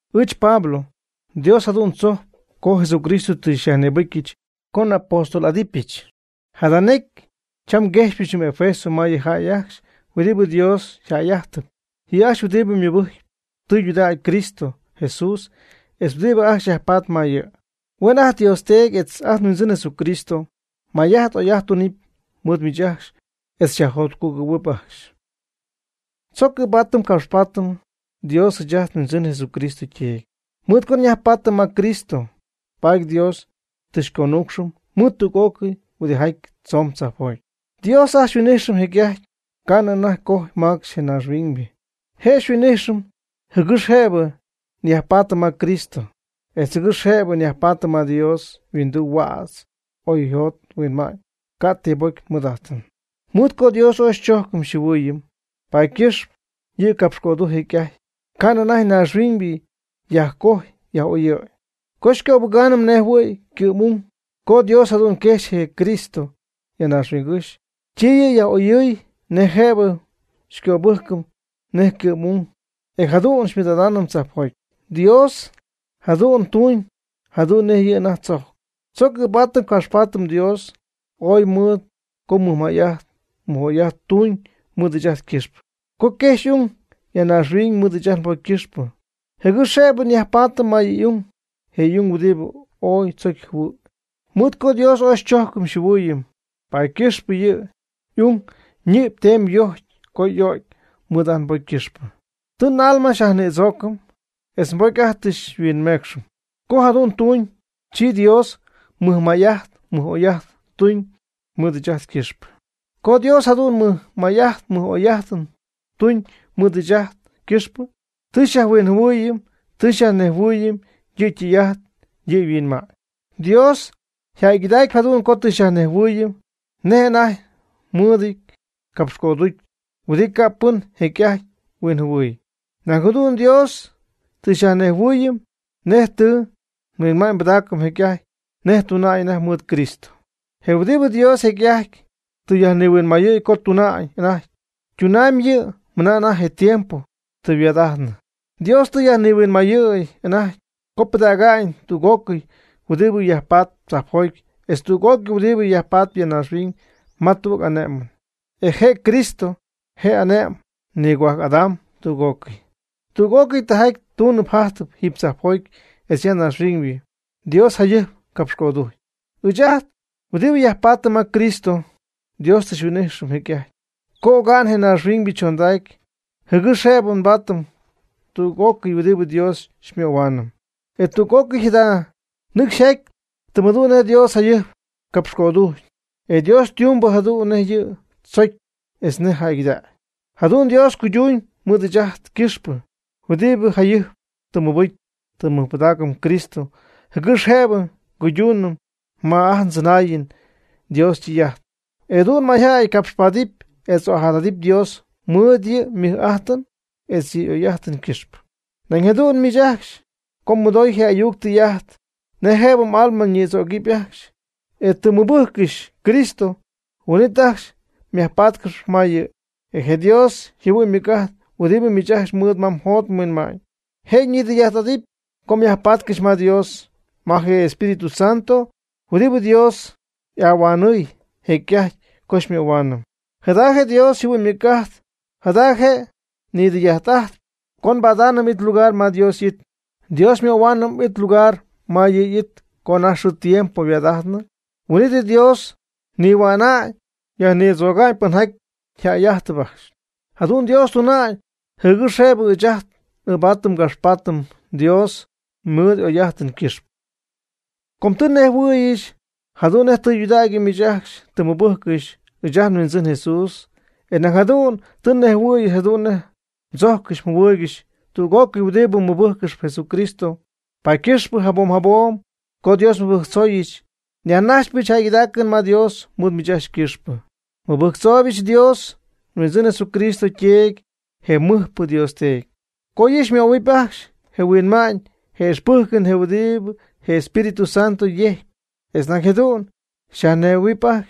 Ɨɨch Pablo, Dios jadu'n tzojcp co Jesucristo tɨ xyajnïbɨcyɨch co n'apóstol'adɨpyɨch. Jada necy cham nguejxypɨch jɨm Efeso ma yɨ jäy ajcxy huɨdibɨ Dios yjäy'ajtɨp, yɨ' ajcxy huɨdibɨ mɨbɨjcp tudägy Cristo Jesús etz huɨdibɨ ajcxy yajpatp ma yɨ'. Huen ajt nDios Teedy etz ajt nHuindzɨn Jesucristo may'ajt oy'ajt tunɨpy mɨɨd miich ajcxy etz xyajjotcugɨ̈huɨp ajcxy. Tzoc ɨɨbaatɨm capxpaatɨm Dios ɨɨch ajt nHuindzɨn Jesucristo yTeedy. Mɨɨd co nyajpaatɨm ma Cristo, paady Dios tɨ xyconuucxɨm mɨɨd tüg'ócɨy huidɨjaty tzomb tzajpjoty. Dios ajt xyhuin'ijxɨm jecy'ajty, ca'nɨ anajty cojy macxy je naaxhuiñybɨ. Je' xyhuin'ijxɨm jɨgɨx jëbɨ nyajpaatɨm ma Cristo, etz jɨgɨx jëbɨ nyajpaatɨm ma Dios yhuinduu huädz oy njot nhuinma'ñ, ca' ti bocy nmɨɨd'ajtɨm. Mɨɨd co Dios ooy xychojcɨm xyjɨhuɨɨyɨm, paady ycɨxp yɨ' capxcödujcy jecy'ajty, ca'nɨ anajty naaxhuiñybɨ yajcojy yaj'oyɨ̈y, co xycöbɨgaanɨm nejjɨhuɨ̈y ycɨ'm y'ung. Co Dios jadu'n quejxy je Cristo ya naaxhuingɨ́xy, chi yɨ' yaj'oyɨɨy nej jëbɨ xycöbɨjcɨm nej ycɨ'm y'ung, e jadu'n xymɨɨd'adaanɨm tzajpjoty. Dios jadu'n ytuñ jadu'n nej yɨ' anajty tzocyɨn. Tzoc ɨɨbaatɨm capxpaatɨm Dios ooy mɨɨd co mɨjmay'ajt mɨj'oy'ajt tuuñ mɨɨd ɨɨch ajt ycɨxpɨ, co quejxy y'ung ya naaxhuiñ mɨɨd ɨɨch ajt nbocy ycɨxpɨ, jɨgɨx jëbɨ nyajpaatɨm ma yɨ' y'ung, je' y'ung huɨdibɨ ooy tzocy jɨhuɨ̈y. Mɨɨd co Dios ooy xychojcɨm xyjɨhuɨɨyɨm paady ycɨxpɨ yɨ' y'ung ñɨ'py teemy yojcy co y'o'cy mɨɨd ajt nbocy ycɨxpɨ, tɨ ajt n'alma xyajnïdzoocɨm etz nbocy ajt tɨ xyhuinmeecxɨm. Co jadu'n ytuuñ, chi Dios mɨjmay'ajt mɨj'oy'ajt tuuñ mɨɨd ɨɨch ajt ycɨxpɨ. Co Dios jadu'n mɨjmay'ajt mɨj'oy'ajt tuñ mɨɨd ɨɨch ajt ycɨxpɨ, tɨ xyajhuinjɨhuɨɨyɨm tɨ xyajnejhuɨɨyɨm yɨ ytɨy'ajt yɨ yhuinma'ñ. Dios yjäygɨdacpy jadu'n co tɨ xyajnejhuɨɨyɨm nej anajty mɨɨdɨty capxcöducy huɨdibɨ ca' pɨn jecy'ajty huinjɨhuɨy. Nañ jadu'n Dios tɨ xyajnejhuɨɨyɨm nej tɨ yhuinma'ñypɨdacy jecy'ajty nej ytuna'ñ anajty mɨɨd Cristo. Je huɨdibɨ Dios jecy'ajty tɨ yajnihuinmayɨɨy co tuna'ñ anajty, ytunamyb yɨ' mɨna anajty je tiempo tɨ yhuaad'ajtnɨ. Dios tɨ yajnihuinmayɨ̈y anajty co pɨdäga'ñ tüg'ócɨy huɨdi yajpatp tzajpjoty etz tüg'ócɨy huɨdibɨ yajpatp ya naaxhuiñ ma tüg ane'mɨn, e je Cristo je' ane'mamb nigohuajc'adamb tüg'ócɨy. Tüg'ócɨy tijaty tunɨ yjajtɨ jiiby tzajpjoty etz ya naaxhuiñ Dios jayɨjp capxcödujc. Ɨɨch ajt huɨdibɨ nyajpaatɨm ma Cristo, Dios tɨ xyhuin'ijxɨm jecy'ajty co oga'n je naaxhuiñybɨ chondacy jɨgɨx jëbɨ nbaatɨm tüg'ócɨy huɨdibɨ Dios xymöhuaanɨm. E tüg'ócɨy jada nɨcxy yjaty tɨm jadu'n nej Dios jayɨjp capxcödujcy, e Dios ytumyb jadu'n nej yɨ' tzocy etz nej jäygɨdägy. Jadu'n Dios cuydumyb mɨɨd ɨɨch ajt ycɨxpɨ, huɨdibɨ jayɨjp tɨ nmɨbɨjcɨm tɨ nmɨjpɨdaacɨm Cristo, jɨgɨx jëbɨ nguydunɨm ma ajt ndzɨnaayɨn Dios ytɨy'ajt, e jadu'n mayjäy capxpaadɨp etz ojadadɨp Dios mɨɨd yɨ' ymɨj'ajtɨn etz yɨ' y'oy'ajtɨn ycɨxpɨ. Nañ jadu'n miich ajcxy co mmɨdooy je ayuc tɨy'ajt nej jëbɨ m'alma ñïdzögɨpy ajcxy, e tɨ mmɨbɨjccɨxy Cristo, huin'it ajcxy myajpaatcɨxy ma yɨ', e je Dios yjɨhuɨ'ñ ymɨc'ajt huɨdibɨ miich ajcxy mɨɨd ma mjot mhuinma'ñ, je' nidɨy'ajt'ajtp co myajpaatcɨxy ma Dios. Jada je' je Espíritu Santo huɨdibɨ Dios y'ahuanɨɨy jecy'ajty co xymöhuaanɨm. Jada Dios yjɨhuɨ'ñ ymɨc'ajt jada je' nidɨy'ajt'ajtp co nbadaanɨm it lugar ma Dios y'it. Dios xymöhuaanɨm it lugar ma yɨ' y'it co anajty xɨɨ tiempo yhuaad'ajtnɨ huin'it Dios nihua'na'ñ yajnïdzöga'ñ pɨnjaty yjäy'ajtɨp ajcxy. Jadu'n Dios tuna'ñ, jɨgɨx jëbɨ ɨɨch ajt n'ɨɨbaatɨm ngapxpaatɨm Dios mɨɨd y'oy'ajtɨn ycɨxpɨ. Com tɨ nnejhuɨ̈yɨch jadu'n nej tɨydudägy miich ajcxy tɨ mmɨbɨjccɨxy ɨɨch ajt nHuindzɨn Jesús, e nañ jadu'n tɨ nnejhuɨ̈yɨch jadu'n nej mdzojccɨxy mjɨhuɨɨygɨxy tüg'ócɨy huɨdibɨ mɨbɨjccɨxp Jesucristo. Paady ycɨxp jabom jabom co Dios nmɨbɨjctzooyɨch, nyajnajxpɨch jäygɨdaacɨn ma Dios mɨɨd miich ajcxy ycɨxpɨ. Mɨbɨjctzooybɨch Dios, nHuindzɨn Jesucristo yTeedy, je mɨjpɨ Dios Teedy, co yɨ' xymöhuɨp ajcxy je huinma'ñ je ixpɨjcɨn huɨdibɨ je Espíritu Santo yejcpy, etz nañ jadu'n xyajnejhuɨ̈huɨpy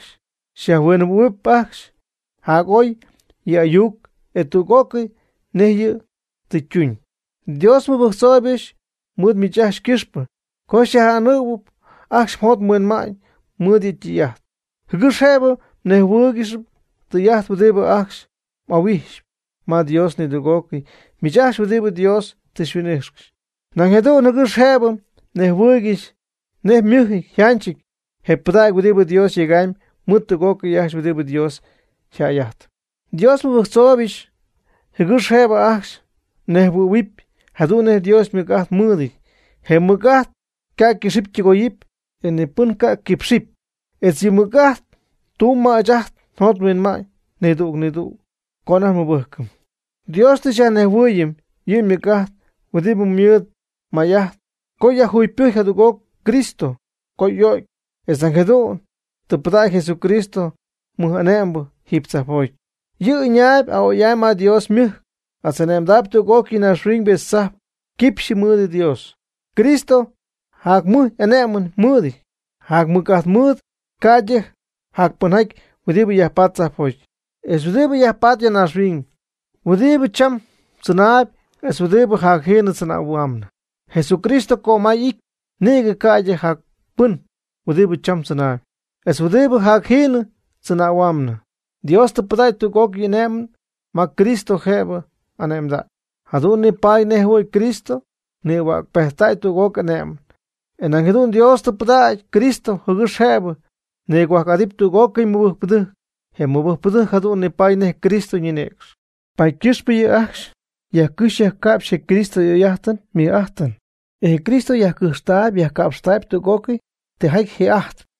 xyajhuinjɨhuɨ̈huɨpy ajcxy jac'oy yɨ' y'ayuc, e tüg'ócɨy nej yɨ' tɨ ytuuñ. Dios nmɨbɨjctzooybɨch mɨɨd miich ajcxy ycɨxpɨ, co xyaj'anɨɨyɨp ajcxy mjot mhuinma'ñ mɨɨd yɨ' ytɨy'ajt, jɨgɨx jëbɨ mnejhuɨ́ɨygɨxɨpy tijaty huɨdibɨ ajcxy m'ahuijxyp ma Dios, nidüg'ócɨy miich ajcxy huɨdibɨ Dios tɨ huin'ixy. Nañ jadu'n jɨgɨx jëbɨ mnejhuɨɨygɨxy nej ymɨjɨty yjanchɨty je pɨdägy huɨdibɨ Dios yegamyb mɨɨd tüg'ócɨy ajcxy huɨdibɨ Dios yjäy'ajtɨp. Dios nmɨbɨjctzooybɨch jɨgɨx jëbɨ ajcxy mnejhuɨ̈huɨpy jadu'n nej Dios ymɨc'ajt mɨɨdɨty. Je' ymɨc'ajt ca' ycɨxɨpy ytɨgoyɨpy, e ni pɨn ca quipxɨpy. Etz yɨ' ymɨc'ajt tumb ma ɨɨch ajt njot nhuinma'ñ nidüg nidüg co ajt nmɨbɨjcɨm. Dios tɨ xyajnejhuɨɨyɨm yɨ' ymɨc'ajt huɨdibɨ ymɨɨd may'amy co yajjugypɨjcy jadüg'oc Cristo co y'o'cy, etz nañ jadu'n tɨ pɨdägy Jesucristo mɨj'ane'mbɨ jiiby tzajpjoty. Yɨ' ɨñaayb a'oy'amy ma Dios ymɨjc, etz ane'mdäy tüg'ócɨy naaxhuiñ etz tzajp quipxyɨ mɨɨd Dios. Cristo jac mɨj'ane'mɨn ymɨɨd, jac mɨc'ajt mɨɨd, ca'ydɨ jacpɨnjaty huɨdibɨ jayajpatp tzajpjoty, etz huɨdibɨ jayajpatp ya naaxhuiñ, huɨdibɨ cham tzɨnaayb etz huɨdibɨ jacjiinɨ tzɨnähuaamnɨ. Jesucristo cömay y'ity nïgɨ, ca'ydɨ jac pɨn huɨdibɨ cham tzɨnaayb, etz huɨdibɨ jacjiinɨ tzɨnähuaamnɨ. Dios tɨ pɨdägy tüg'ócɨy ane'mɨn ma Cristo jëbɨ ane'mdäy. Jadu'n nipaady nej jɨhuɨ̈y Cristo nïhuäcpejttäy tüg'ócɨy ane'mɨn. E nañ jadu'n Dios tɨ pɨdägy Cristo jɨgɨx jëbɨ nigohuajc'adɨpy tüg'ócɨy mɨbɨjcpɨdɨjc. Je mɨbɨjcpɨdɨjc jadu'n nipaady nej Cristo ñinïcx, paady ycɨxpɨ yɨ' ajcxy yajcɨxy yajca'pxy je Cristo y'oy'ajtɨn ymɨj'ajtɨn. E je Cristo yajcɨjxtaayb yajca'pxtaayb tüg'ócɨy tijaty ji ajtp.